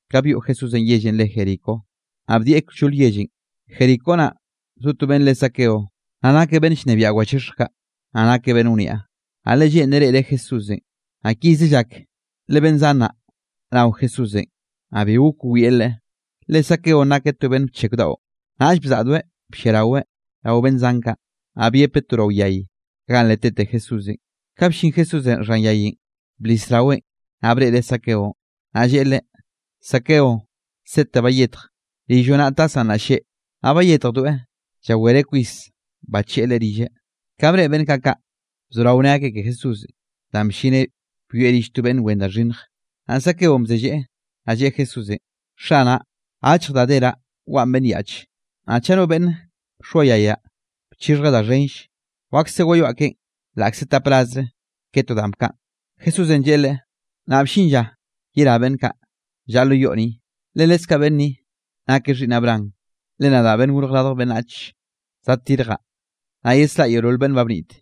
Ka byoꞌ Jesúsenꞌ yellenꞌ re Jericó, naꞌ bdieꞌ kllol yellenꞌ. Jericó, naꞌ zo to beꞌnn re Zaqueo, naꞌ nakeꞌ beꞌnn llnebiaꞌ wachixhj kaꞌ, naꞌ nakeꞌ beꞌnn wniaꞌ. Naꞌ le lleꞌnreꞌ reꞌreꞌ Jesúsenꞌ, naꞌ kize llak le beꞌnn zan naꞌ nao Jesúsenꞌ; naꞌ bi gok wieꞌ Leꞌe, le Zaqueonꞌ nakeꞌ to beꞌnn bcheko daꞌo. Naꞌll bzaꞌdoeꞌ blliaraweꞌ rao beꞌnn zan kaꞌ, naꞌ byepeꞌ to rao yay ganꞌ le tete Jesúsenꞌ. Ka bllin Jesúsenꞌ xhan yayenꞌ, blis raweꞌn, naꞌ breꞌreꞌ Zaqueonꞌ, naꞌ lleꞌe leꞌe: —Zaqueo, sete bayetj, rilloꞌ naꞌ tasaꞌ nnaꞌ lleꞌ. Naꞌ bayetjdoeꞌ, llawereꞌ kwis bacheꞌe Leꞌe rilleꞌ. Ka breꞌe beꞌnn kaꞌ kaꞌ, bzorao nne akeꞌ ke Jesúsenꞌ danꞌ bllineꞌ byoeꞌ rill to beꞌnn wen da xhinnj. Naꞌ Zaqueonꞌ bzelleꞌe, naꞌ lleꞌe Jesúsenꞌ: —Xanaꞌ, achj da deraꞌ waꞌan beꞌnn yaꞌche, naꞌ chaꞌ no beꞌnn bxoayayaꞌ bchixhjeꞌ da xhenll, wakse wayoaꞌ keꞌen laꞌkze tap rasre ke to danꞌ bkaꞌan. Jesúsenꞌ lleꞌe leꞌe: —Naꞌ bllin lla yerá beꞌnn kaꞌ, llaꞌa lo yoꞌ ni, le leskaꞌ beꞌnn ni nakeꞌ xhiꞌnn Abraham. Le nadaꞌ Beꞌnnenꞌ Gorj Radj Beꞌnnach zaddirjaꞌ, naꞌ yesraꞌa yeolol beꞌnn ba bnit.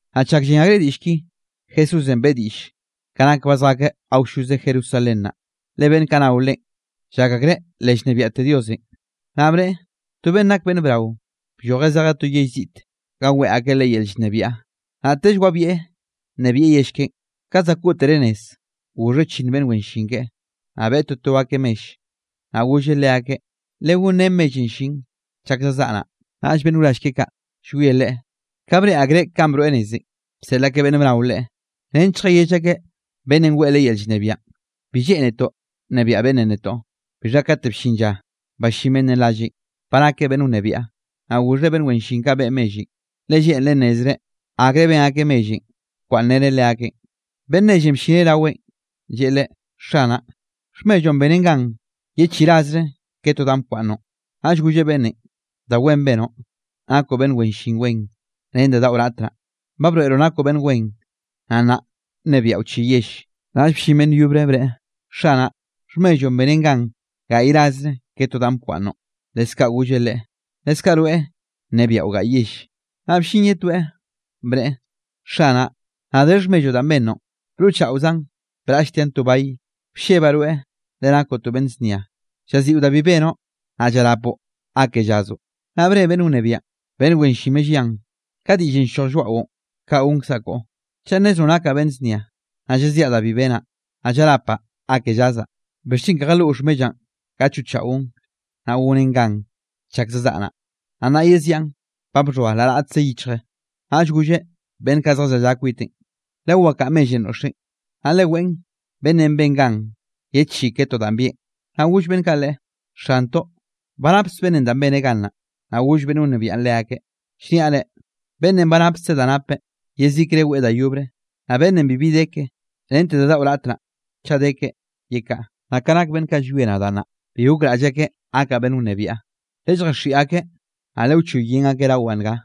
Naꞌ chak llen akreꞌ diꞌll ki, Jesúsenꞌ beꞌe diꞌll ka nak ba zjakeꞌ awlloze Jerusalén naꞌ, le beꞌnn kaꞌ nao Leꞌen, llak akreꞌ le llnebiaꞌte Diosenꞌ. Naꞌ bneꞌe: —To beꞌnn nak beꞌnn brao, bllojeꞌ zejeꞌ to yell ziꞌte ga weꞌe akeꞌ leꞌe yel llnebiaꞌ, naꞌtell wabieꞌ nnebieꞌ yell keꞌen. Ka za koꞌtereꞌ nez, goxheꞌ chi beꞌnn wen llin keꞌe, naꞌ beꞌe toto akeꞌ mell, naꞌ golleꞌ leakeꞌ: “Legonrén mellenꞌ llin chak zazaꞌa naꞌ.” Naꞌll beꞌnn wrall keꞌe kaꞌ llwie leꞌe, ka breꞌe akreꞌ ba broeꞌ nezenꞌ, bseꞌl akeꞌ beꞌnn bnao leꞌe, nench lljayell akeꞌ beꞌnnenꞌ weꞌe leꞌe yel llnebiaꞌn: “Bi lleꞌnetoꞌ nnebiaꞌ beꞌnnenꞌ netoꞌ.” Bixha kate bllin lla ballín beꞌnnenꞌ ralleꞌn, ba nakeꞌ beꞌnn wnebiaꞌ, naꞌ goxheꞌ beꞌnn wen llin kaꞌ beꞌe mellenꞌ, le lleꞌnreꞌ nnezreꞌ akre ben akeꞌ mellenꞌ bkwaꞌnnreneꞌ leakeꞌn. Beꞌnn nellenꞌ bllineꞌ raweꞌn, lleꞌe leꞌe: “Xanaꞌ, xhmelloꞌn benen gan ye chi rasre ke to danꞌ bkwaꞌnnoꞌn.” Naꞌll golleꞌ beꞌnnenꞌ: “Da wen benoꞌ, nakoꞌ beꞌnn wen llin wen, ren da daꞌo raꞌt naꞌ, ba broeꞌroꞌ nakoꞌ beꞌnn wen. Naꞌ nnaꞌ nnebiaꞌo chi yell.” Naꞌll bllin beꞌnn yobre bneꞌe: “Xanaꞌ, xhmelloꞌn benen gan gaꞌy rasre ke to danꞌ bkwaꞌnnoꞌn.” Leskaꞌ golleꞌ leꞌe: “Leskaꞌ rweꞌ nnebiaꞌo gaꞌy yell.” Naꞌ bllin ye toeꞌ, bneꞌe: “Xanaꞌ, nna de xhmelloꞌn danꞌ bennoꞌn, broꞌchaꞌozaꞌn braꞌlltiaꞌn to bay, bllebaꞌ rweꞌ, le nakoꞌ to beꞌnn znia, llaziꞌo da bi benoꞌ, naꞌ llrapoꞌ ga ke llazoꞌ.” Naꞌ bne beꞌnn wnebiaꞌn: “Beꞌnn wen llin mellian, ka diꞌllenꞌ ll-lloj lloaꞌon, kaꞌ gonkzaꞌ koꞌo. Chaꞌ nnezroꞌ nakaꞌ beꞌnn znia, naꞌ llaziaꞌ da bi benaꞌ, naꞌ llrapaꞌ ga ke llazaꞌ, ¿bixchen ke jaloꞌ xhmellaꞌn ga choꞌchaꞌon naꞌ gonen gan chak zazaꞌa naꞌ, naꞌ nna yeziaꞌn ba xhoa la raꞌtze yichje?” Naꞌll golleꞌ beꞌnn kaꞌ zjallaꞌa kwiteꞌn: “Lewakaꞌa mellenꞌ noꞌxeꞌn, naꞌ leweꞌn beꞌnnenꞌ ben gan ye chi ke to danꞌ bieꞌn.” Naꞌ goll beꞌnn kaꞌ leꞌe: “¡Xantoꞌ, ba napkzeꞌ danꞌ beneꞌ gan naꞌ!” Naꞌ goll beꞌnn wnebiaꞌn leakeꞌ: “Llniaꞌ reꞌ, beꞌnnenꞌ ba napkzeꞌ da napeꞌ, yezikre weꞌe da yobre, naꞌ beꞌnnenꞌ bibi de keꞌe, rente da daꞌo raꞌt, chaꞌ de keꞌe, yekaꞌa. Naꞌ ka nak beꞌnn kaꞌ llwie nadaꞌ naꞌ, bi gokraꞌll akeꞌ gakaꞌ beꞌnn wnebiaꞌ, lelljaxiꞌi akeꞌ, naꞌ lewchoy yen akeꞌ rawaꞌ nga.”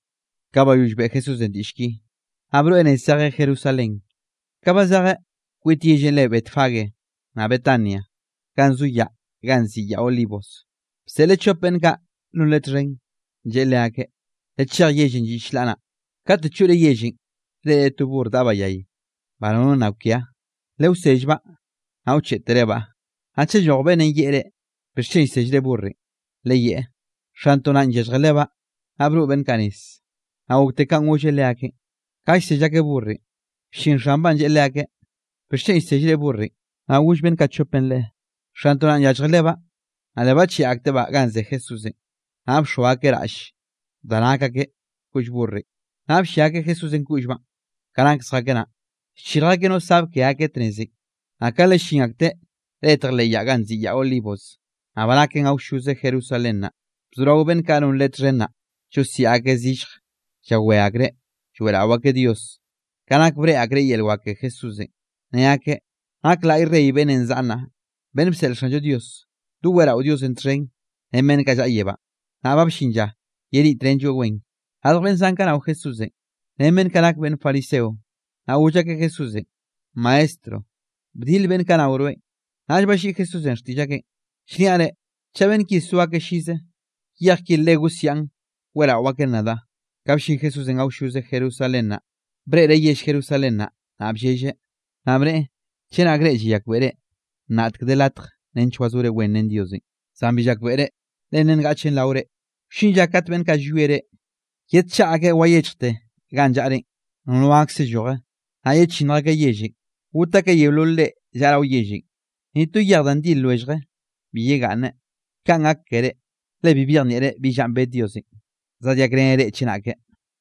Ka bayoll beꞌe Jesúsenꞌ diꞌll ki, naꞌ broeꞌ nez zejeꞌ Jerusalén. Ka ba zejeꞌ kwit yellenꞌ re Betfagé naꞌ Betania, ganꞌ zo yaꞌn ganꞌ nziꞌi Yaꞌ Olivos, bseꞌleꞌ chop beꞌnn kaꞌ non Leꞌe txhen, lleꞌe leakeꞌ: —Lechej yellenꞌ lliꞌ chlaꞌ naꞌ, kate choꞌre yellenꞌ reꞌre to burr daꞌbaꞌ yay, ba nono nna kwia, lewsellbaꞌ, naꞌ wcheꞌterebaꞌ. Naꞌ chaꞌ lloj beꞌnn yeꞌe reꞌ: “¿Bixchen llsellre burrenꞌ?”, leyeꞌe: “Xantoꞌ naꞌn yallje lebaꞌ.” Naꞌ broꞌ beꞌnn kaꞌ nez, naꞌ gokte kanꞌ golleꞌ leakeꞌn. Ka llsell akeꞌ burrenꞌ, bllin xanbaꞌn lleꞌe leakeꞌ: —¿Bixchen llsellre burrenꞌ? Naꞌ goll beꞌnn kaꞌ chopenꞌ leꞌe: —Xantoꞌ naꞌn yallje lebaꞌ. Naꞌ le bacheꞌe aktebaꞌ ganꞌ ze Jesúsenꞌ, naꞌ bxoa akeꞌ raꞌll da nak akeꞌ koꞌll burrenꞌ, naꞌ bllia akeꞌ Jesúsenꞌ koꞌllbaꞌn. Ka nak zjakeꞌ naꞌn, llchirj akeꞌ no sab ke akeꞌ tnezenꞌ. Naꞌ ka le llin akteꞌ letj leꞌ yaꞌ ganꞌ nziꞌi Yaꞌ Olivos, naꞌ ba naken awlloze Jerusalén naꞌ, bzorao beꞌnn kaꞌ non Leꞌe txhen naꞌ, llosiaꞌ akeꞌ zillj llawé akreꞌ, lloeꞌrao akeꞌ Dios, ka nak breꞌe akreꞌ yel wak ke Jesúsenꞌ, ne akeꞌ: —¡Nak laꞌy Rey beꞌnnenꞌ zaꞌa nnaꞌ, beꞌnn bseꞌl Xanllo Dios! ¡Doweꞌrao Diosenꞌ txhen ren beꞌnn kaꞌ llaꞌa yebánꞌ, nnaꞌ ba bllin lla yeniꞌtrenlloeꞌ wen! Radj beꞌnn zan kaꞌ nao Jesúsenꞌ, ren beꞌnn kaꞌ nak beꞌnn fariseo, naꞌ goll akeꞌ Jesúsenꞌ: —Maestro, bdil beꞌnn kaꞌ nao rweꞌn. Naꞌll balliꞌi Jesúsenꞌ xtiꞌll akeꞌn: —Llniaꞌ reꞌ, chaꞌ beꞌnn ki so akeꞌ llize, yej ki le gosiaꞌn weꞌrao akeꞌn nadaꞌ. Ka bllin Jesúsenꞌ awlloze Jerusalén naꞌ, breꞌreꞌ yell Jerusalén naꞌ, naꞌ bllelleꞌ, naꞌ bneꞌe: —¡Chenak reꞌ llayakbeꞌre, nnaꞌtek de latj nench wazore wen ren Diosenꞌ! Zan bi llakbeꞌre, le nna ngaꞌchen rao reꞌ. Wllin lla kate beꞌnn kaꞌ llwie reꞌ, yedchaꞌa akeꞌ wayechjte ganꞌ llaꞌrenꞌ, nono gakse lloje. Naꞌ yechinnj akeꞌ yellenꞌ, got akeꞌ yeolol reꞌ llaꞌa rao yellenꞌ. Ni to yej da ndil lwellje bi yegaꞌnne, kaꞌn gak keré, le bi byejnieꞌre bi llanꞌ bed Diosenꞌ, zadyakreneꞌ reꞌ chenake.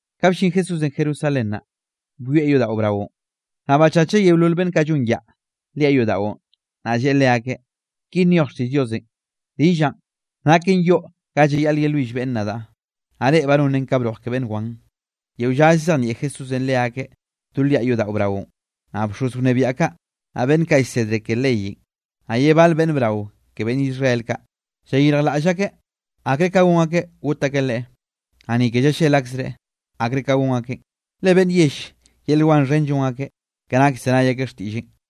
Ka bllin Jesúsenꞌ Jerusalén naꞌ, byoeꞌ yodaꞌo braonꞌ, naꞌ bachacheꞌ yeolol beꞌnn kaꞌ llon yaꞌa liaꞌ yodaꞌon, naꞌ lleꞌe leakeꞌ: —Ki nyoj xtiꞌll Diosenꞌ: “Rillaꞌn, naken yoꞌ ga llayaꞌl yelwill beꞌnn nadaꞌ”, naꞌ reꞌ ba nonren ka broj ke beꞌnn wan. Yeo lla llzejnieꞌ Jesúsenꞌ leakeꞌ do liaꞌ yodaꞌo braonꞌ, naꞌ bxoz wnebiaꞌ kaꞌ, naꞌ beꞌnn kaꞌ llsedre ke leyenꞌ, naꞌ ye bal beꞌnn brao ke beꞌnn Israel kaꞌ, llayirjlaꞌll akeꞌ akre ka gon akeꞌ got akeꞌ Leꞌe. Naꞌ ni ke llallel akzreꞌ akre ka gon akeꞌ, le beꞌnn yell yel wan xhen llon akeꞌ, ka nak llzenay akeꞌ xtiꞌlleꞌn.